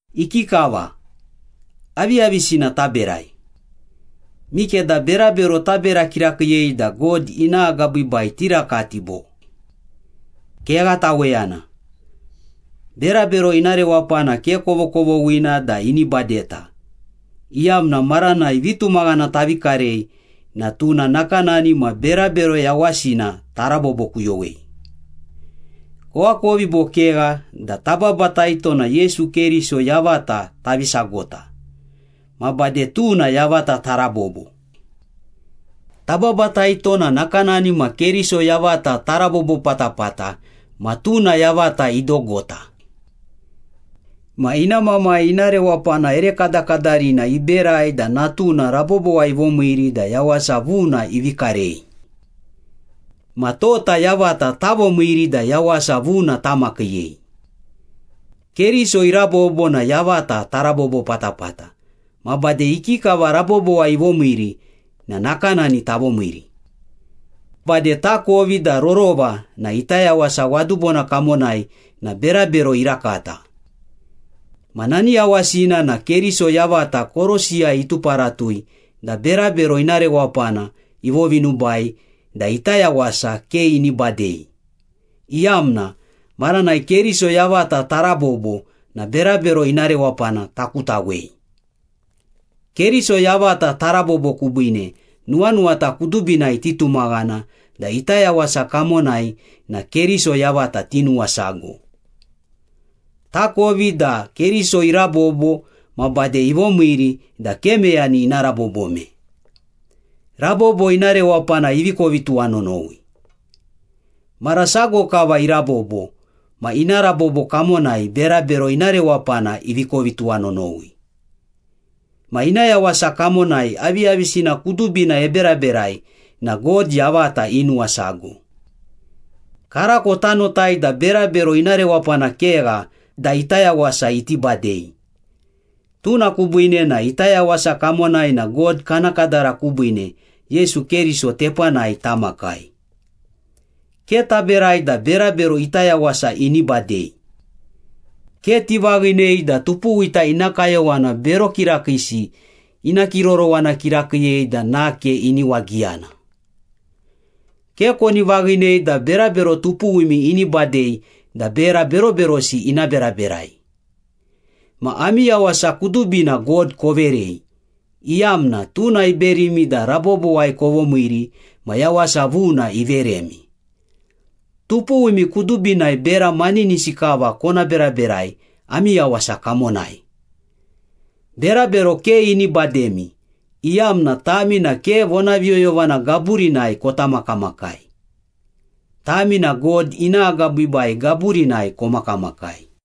Ikikava, aviyavisina taberai? Mikeda berabero tabera kirakiiyei da God ina agabiibai tirakati, bo? Kegha taweyana. Berabero ina rewapana ke kovokovoghina da ini badeta, iyamna maranai vitumaghana tavi karei na tuna nakanani ma berabero yawasina tarabobokuyowei. Koakovi bo kegha da tababataito na Yesu Keriso yavata tavi sagota, ma bade tuna yavata tarabobo. Tababataito na nakanani ma Keriso yavata tarabobo patapata ma tuna yavata idogota. Ma ina Mamai ina rewapana ere kadakadarina iberai da Natuna rabobowai ivomiiri da yawasa vuna ivi karei. Ma tota yavata tavomiiri da yawasa vuna tamakiiyei. Keriso irabobo na yavata tarabobo patapata, ma bade ikikava rabobowai ivomiiri na nakanani tavomiiri. Bade takovi da rorova na ita yawasa wadubona kamonai na berabero irakata. Ma nani yawasina na Keriso yavata korosiyai ituparatui da berabero ina rewapana ivovinubai da ita yawasa ke ini badei, iyamna maranai Keriso yavata tarabobo na berabero ina rewapana takutawei. Keriso yavata tarabobo kubiine, nuwanuwata kudubinai titumaghana da ita yawasa kamonai na Keriso yavata tinuwasago. Takovi da Keriso irabobo ma bade ivomiiri da ke meyani ina rabobome. Rabobo ina rewapana ivi kovi tuwanonowi. Mara sago kava irabobo ma ina rabobo kamonai berabero ina rewapana ivi kovi tuwanonowi. Ma ina yawasa kamonai aviyavisina kudubina eberaberai na God yavata inuwasago. Karako tanotai da berabero ina rewapana kegha da ita yawasa iti badei. Tuna kubiine na ita yawasa kamonai na God kana kadara kubiine Yesu Keriso tepanai tamakai. Ke taberai da berabero ita yawasa ini badei. Ke tivaghinei da tupuwita ina kayowana bero kirakiisi ina kirorowana kirakiiyei da nake ini wagiyana. Ke koni vaghinei da berabero tupuwimi ini badei da bera beroberosi ina beraberai. Ma ami yawasa kudubina God koverei, iyamna tuna iberimi da rabobowai kovomiiri ma yawasa vuna iveremi. Tupuwimi kudubinai bera maninisi kava kona beraberai ami yawasa kamonai. Berabero ke ini bademi, iyamna tami na ke vonaviyoyovana gaburinai kota makamakai. Tami na God ina agabiibai gaburinai komakamakai.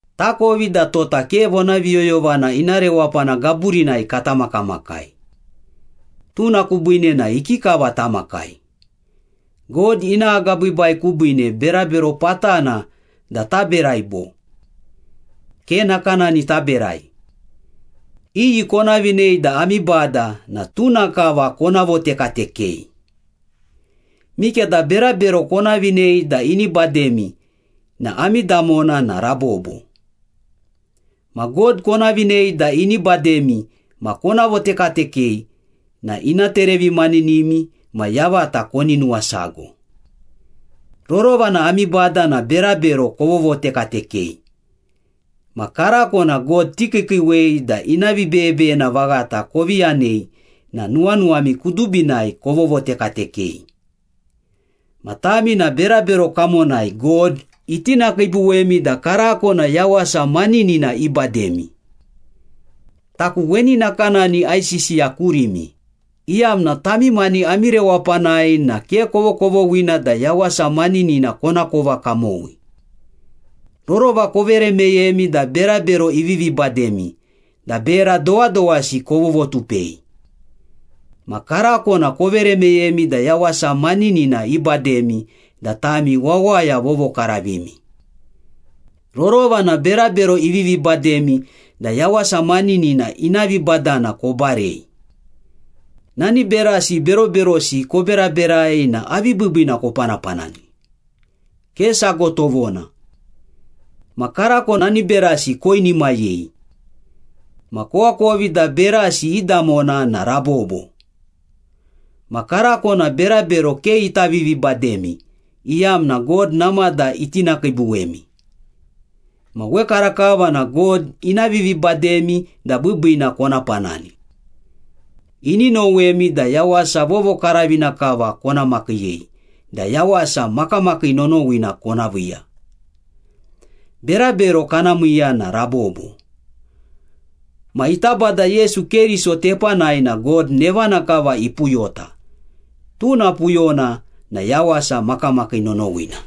Takovi da tota ke vonaviyoyovana ina rewapana gaburinai kata makamakai. Tuna kubiine na ikikava tamakai? God ina agabiibai kubiine berabero patana da taberai bo? Ke nakanani taberai. Iyi kona vinei da ami bada na tuna kava kona votekatekei. Mikeda berabero kona vinei da ini bademi na ami damona na rabobo. Ma God kona vinei da ini bademi ma kona votekatekei na ina terevimaninimi ma yavata koni nuwasago. Rorova na ami bada na berabero kovovotekatekei. Ma karako na God tikiikiiwei da ina vibeyebeyena vaghata kovi yanei na nuwanuwami kudubinai kovovotekatekei. Ma tami na berabero kamonai God itinakiibuwemi da karako na yawasa maninina ibademi. Taku weni nakanani aisisiya kurimi, iyamna tami mani ami rewapanai na ke kovokovoghina da yawasa maninina konakova kamowi. Rorova kovere meyemi da berabero ivivi bademi da bera dowadowasi kovovotupei. Ma karako na kovere meyemi da yawasa maninina ibademi da tami wawaya vovokaravimi. Rorova na berabero ivivi bademi da yawasa maninina ina vibadana kobarei. Nani berasi beroberosi koberaberai na avi biibiina kopanapanani? Ke sago tovona. Ma karako nani berasi koinimayei. Ma koakovi da berasi i damona na rabobo. Ma karako na berabero ke ita vivibademi, iyamna God namada itinakiibuwemi. Ma wekarakava na God ina vivibademi da biibiina kona panani. Ini nowemi da yawasa vovokaravina kava kona makiiyei da yawasa makamakii nonowina kona viiya. Berabero kana miiya na rabobo. Ma ita Bada Yesu Keriso tepanai na God nevana kava ipuyota, tuna puyona na yawasa makamakii nonowina.